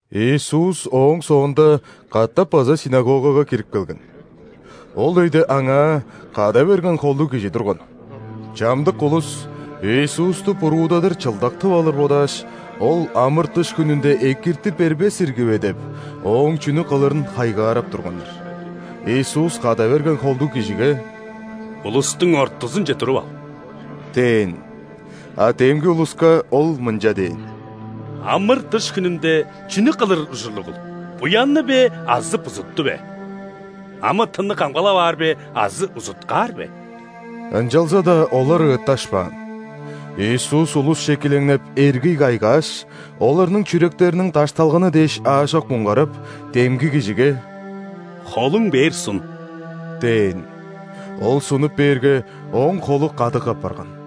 Иисус ооң соонда катап база ·синагогага кирип келген. Ол өйде аңаа када берген холдуг кижи турган. Чамдык улус, Иисусту буруудадыр чылдак тып алыр бодааш, Ол ·амыр-дыш хүнүнде экирти бербес ирги бе деп, Ооң чүнү кылырын хайгаарап турганнар. Иисус када берген холдуг кижиге: «Улустуң ортузунче туруп ал» – дээн. А демги улуска Ол мынча дээн: «Амыр-дыш хүнүнде чүнү кылыр ужурлугул: буянны бе азы бузутту бе? Амы-тынны камгалап аар бе азы узуткаар бе?» Ынчалза-даа олар ыытташпаан. Иисус улусче килеңнеп, эргий кайгааш, оларның чүректериниң дашталганы дээш аажок муңгарап, демги кижиге: «Холуң бээр сун» – дээн. Ол сунуп бээрге, ооң холу кадык апарган.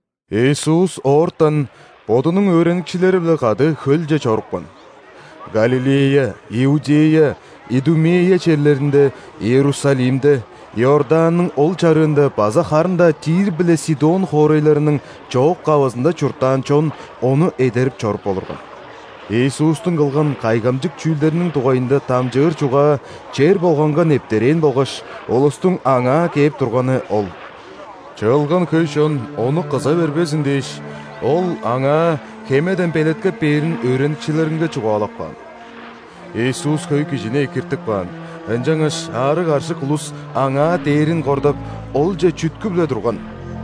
Иисус оортан Бодунуң өөреникчилери-биле кады хөлче чорупкан. Галилея, Иудея, Идумея черлеринде, Иерусалимде, Иорданның ол чарыында база харын-даа Тир биле Сидон хоорайларның чоок-кавызында чурттаан чон Ону эдерип чоруп олурган. Иисустуң кылган кайгамчык чүүлдериниң дугайында дамчыыр чугаа чер болганга нептерээн болгаш, улустуң Аңаа кээп турганы ол. Чыылган хөй чон Ону кыза бербезин дээш, Ол Аңаа хемеден белеткеп бээрин өөреникчилеринге чугаалап каан. Иисус хөй кижини экиртип каан, ынчангаш аарыг-аржык улус Аңаа дээрин кордап, Олче чүткүп-ле турган.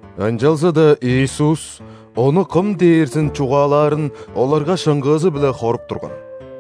Ынчалза-даа Иисус Ону кым дээрзин чугаалаарын оларга шыңгыызы-биле хоруп турган.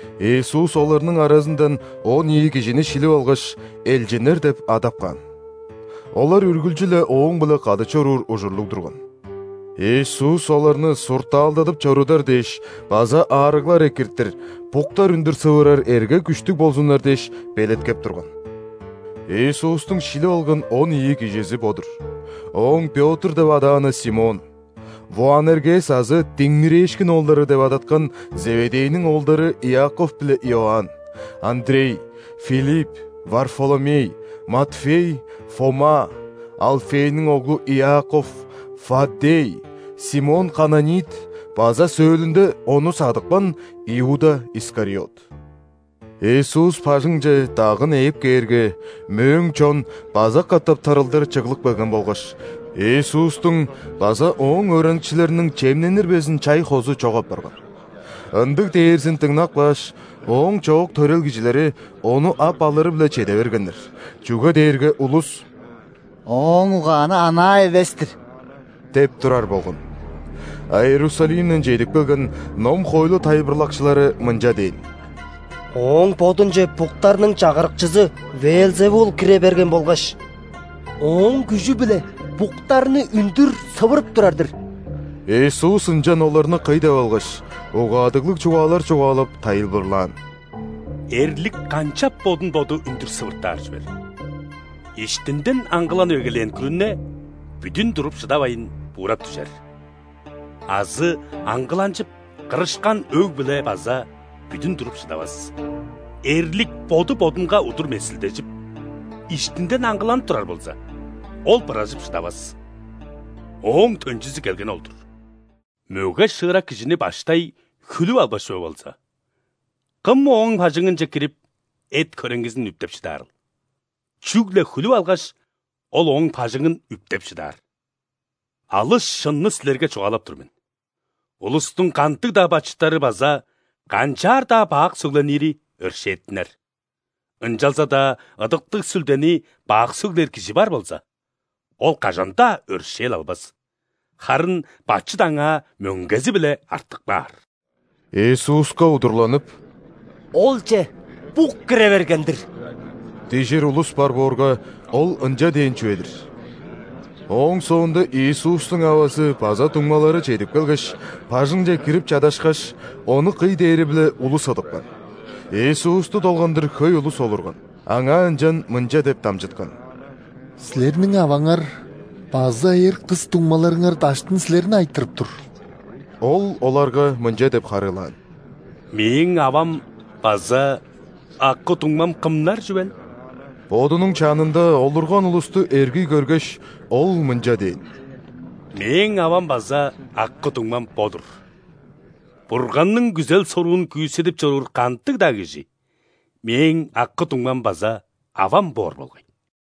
Иисус оларның аразындан он ийи кижини шилип алгаш, элчиннер деп адап каан. Олар үргүлчү-ле Ооң-биле кады чоруур ужурлуг турган. Иисус оларны суртаалдадып чорудар дээш база аарыглар экиртир, буктар үндүр сывырар эрге-күштүг болзуннар дээш, белеткеп турган. Иисустуң шилип алган он ийи кижизи бо-дур: Ооң Пётр деп адааны Симон, Воанергес азы «Диңмирээшкин оолдары» деп адаткан Зеведейниң оолдары Иаков биле Иоанн, Андрей, Филипп, Варфоломей, Матфей, Фома, Алфейниң оглу Иаков, Фаддей, Симон Кананит база сөөлүнде Ону садыпкан Иуда Искариот. Иисус бажыңче дагын ээп кээрге, мөөң чон база катап тырылдыр чыглып келген болгаш, Иисустуң база Ооң өөреникчилериниң чемненир безин чай-хозу чок апарган. Ындыг дээрзин дыңнап кааш, Ооң чоок төрел кижилери Ону ап алыры-биле чеде бергеннер, чүге дээрге улус: «Ооң угааны анаа эвес-тир» – деп турар болган. А Иерусалимден чедип келген ном-хоойлу тайылбырлакчылары мынча дээн: «Ооң Бодунче буктарның чагырыкчызы ·Веелзевул кире берген болгаш, ооң күжү-биле буктарны үндүр сывырып турар-дыр!» Иисус ынчан оларны кый деп алгаш, угаадыглыг чугаалар чугаалап, тайылбырлаан: «Эрлик канчап бодун боду үндүр сывыртаар чүвел? Иштинден аңгыланып эгелээн күрүне бүдүн туруп шыдавайн, буурап дүжер. Азы аңгыланчып, кырышкан өг-бүле база бүдүн туруп шыдавас. Эрлик боду бодунга удур месилдежип, иштинден аңгыланып турар болза, ол быражып шыдавас: ооң төнчүзү келгени ол-дур. Мөге-шыырак кижини баштай хүлүп албас чүве болза, кым ооң бажыңынче кирип, эт-хөреңгизин үптеп шыдаарыл? Чүгле хүлүп алгаш, ол ооң бажыңын үптеп шыдаар. Алыс шынны силерге чугаалап тур мен: улустуң кандыг-даа бачыттары база канчаар-даа бак сөгленири өршээттинер. Ынчалза-даа Ыдыктыг Сүлдени бак сөглээр кижи бар болза, ол кажан-даа өршээл албас, харын бачыт аңаа мөңгези-биле артып каар». Иисуска удурланып: «Олче бук кире берген-дир» – дижир улус бар боорга, Ол ынча дээн чүве-дир. Ооң соонда Иисустуң авазы база дуңмалары чедип келгеш, бажыңче кирип чадашкаш, Ону кый дээри-биле улус ыдыпкан. Иисусту долгандыр хөй улус олурган. Аңаа ынчан мынча деп дамчыткан: «Силерниң аваңар база эр, кыс дуңмаларыңар даштын Силерни айтырып тур». Ол оларга мынча деп харыылаан: «Мээң авам база акы-дуңмам кымнар чүвел?» Бодунуң чанында олурган улусту эргий көргеш, Ол мынча дээн: «Мээң авам база акы-дуңмам бо-дур. Бурганның күзел-соруун күүседип чоруур кандыг-даа кижи Мээң акы-дуңмам база авам боор болгай».